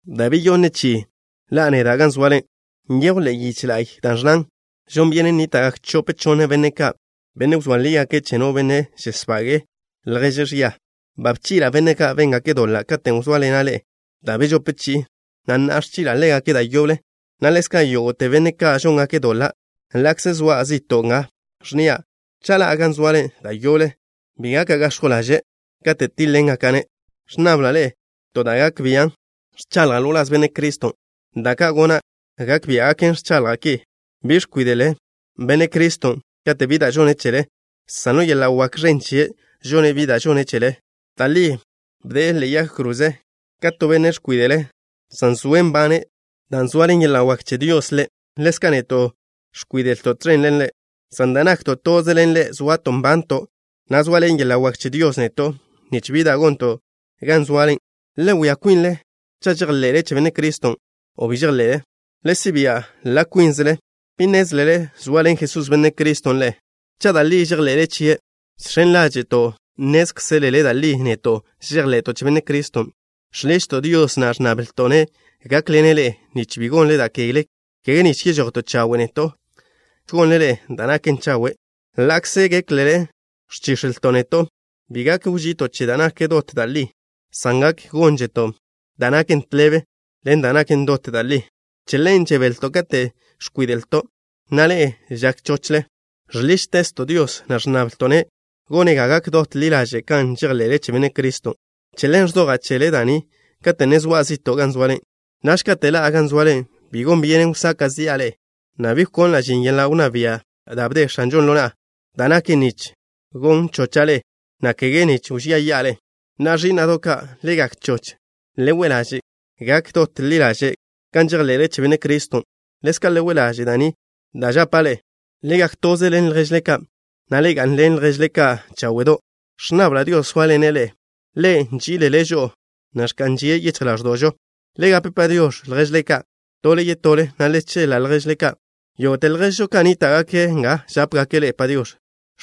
Da' beyonne chi'i ni ḻa'a neda' gan zoale. Nyejw ḻe'e yiche la'y da' ẕnnan: “Žon byenen nníta'gak chope chonne benne' ka', benne' wzóa lígake' cha' no benne' žesbage'e lježe' ẕia.” Ba bchi'la' benne' ka' béngake' doḻa' katen' wzóaḻena' ḻe'e da' bežope chi'i, na' na'a ẕchi'la' ḻégake' da' yoble', na' ḻezka' yógo'te benne' ka' žóngake' doḻa', ḻa'kze zoa' zi'to' nga, ẕnnia': cha' ḻa'a gan zoale da' yoble, bi gaka' gax̱jw ḻaže' katen' tíḻegaka'-ne'. Ẕnnable ḻe'e to da' gak bian' ẕchaḻja' ḻo wláz Benne' Criston'. Da' ka' gona' gak biá'gaken ẕchaḻja' ki. Bi ẕkwíde'le Benne' Criston' kate' bi da' žone' chele, san ḻo yeḻa' wak ẕen chie' žone' bi da' žone' chele. Da' li bde'e ḻe'e yag kroze ka to benne' ẕkwíde'le', san zoe' nbane' dan' zoaḻen yeḻa' wak che Dios Ḻe'. Ḻezka' neto' ẕkwíde'lto' tẕen ḻen Ḻe', san dan' nakto' toze ḻen Ḻe' zoato' nbanto', na' zoaḻen yeḻa' wak che Dios neto' nich bi da' gonto' gan zoale. Le wia kwinle cha' žejḻe'le che Benne' Criston' o bi. Le si' bia' ḻa' kwínzele. ¿Bi nnézlele zoaḻen Jesús, Benne' Criston', ḻe'e, cha' da' li žejḻe'le chie'? Žx̱en ḻáže'to' nnézkzelele da' li neto' žejḻe'to' che Benne' Criston'. Žḻižto' Dios, na' ẕnnablto'-ne' gákḻene' ḻe'e, nich bi gonle da' kegle, kege nich yežojto' chawe' neto', san nich gonle ḻe'e da' naken chawe', ḻa'kze géklele ẕchíx̱elto' neto'. Bi gak wži'ito' che da' nak dot da' li, san gak gónzeto' da' naken tḻebe ḻen da' naken dot da' li. Che ḻen žebelto' kate' ẕkwíde'lto', na' ḻe'e žak chochle. Žḻížtezto' Dios, na' ẕnnablto'-ne' gone' ga gak dot ḻi ḻaže' kan žejḻe'le che Benne' Criston'. Che ḻen ẕzoja' chele ḻe'e da' ni kate' ne zoa' zi'to' gan zoale. Naž kate' ḻa'a gan zoale bi gon byenen wsaka' zi'a ḻe'e, na' bi wkonla' žin yeḻa' wnná bia' da' bde X̱anžon' ḻo na'a, da' naken nich gon chocha' ḻe'e, na' kege nich wžía yi'a ḻe'e. Na'a, ẕí'na'do' ka', le gak choch. Le we' ḻaže' gak dot ḻi ḻaže' kan žejḻe'le che Benne' Criston'. Ḻezka' le we' ḻaže' da' ni da' žapa' ḻe'e. Le gak toze ḻen lježle ka', na' le ga'nḻen lježle ka' cháwe'do'. Ẕnnabla' Dios sóaḻene' ḻe'e. Ḻe' nži'ile' žo'o, na' ẕka'n žie' yichj ḻáẕdo'žo. Le gape “Padiox̱” lježle ka', tole yetole, na' le cheḻa' lježle ka'. Yógo'te lježžo ka' nníta'gake' nga žápegake' ḻe'e “Padiox̱.”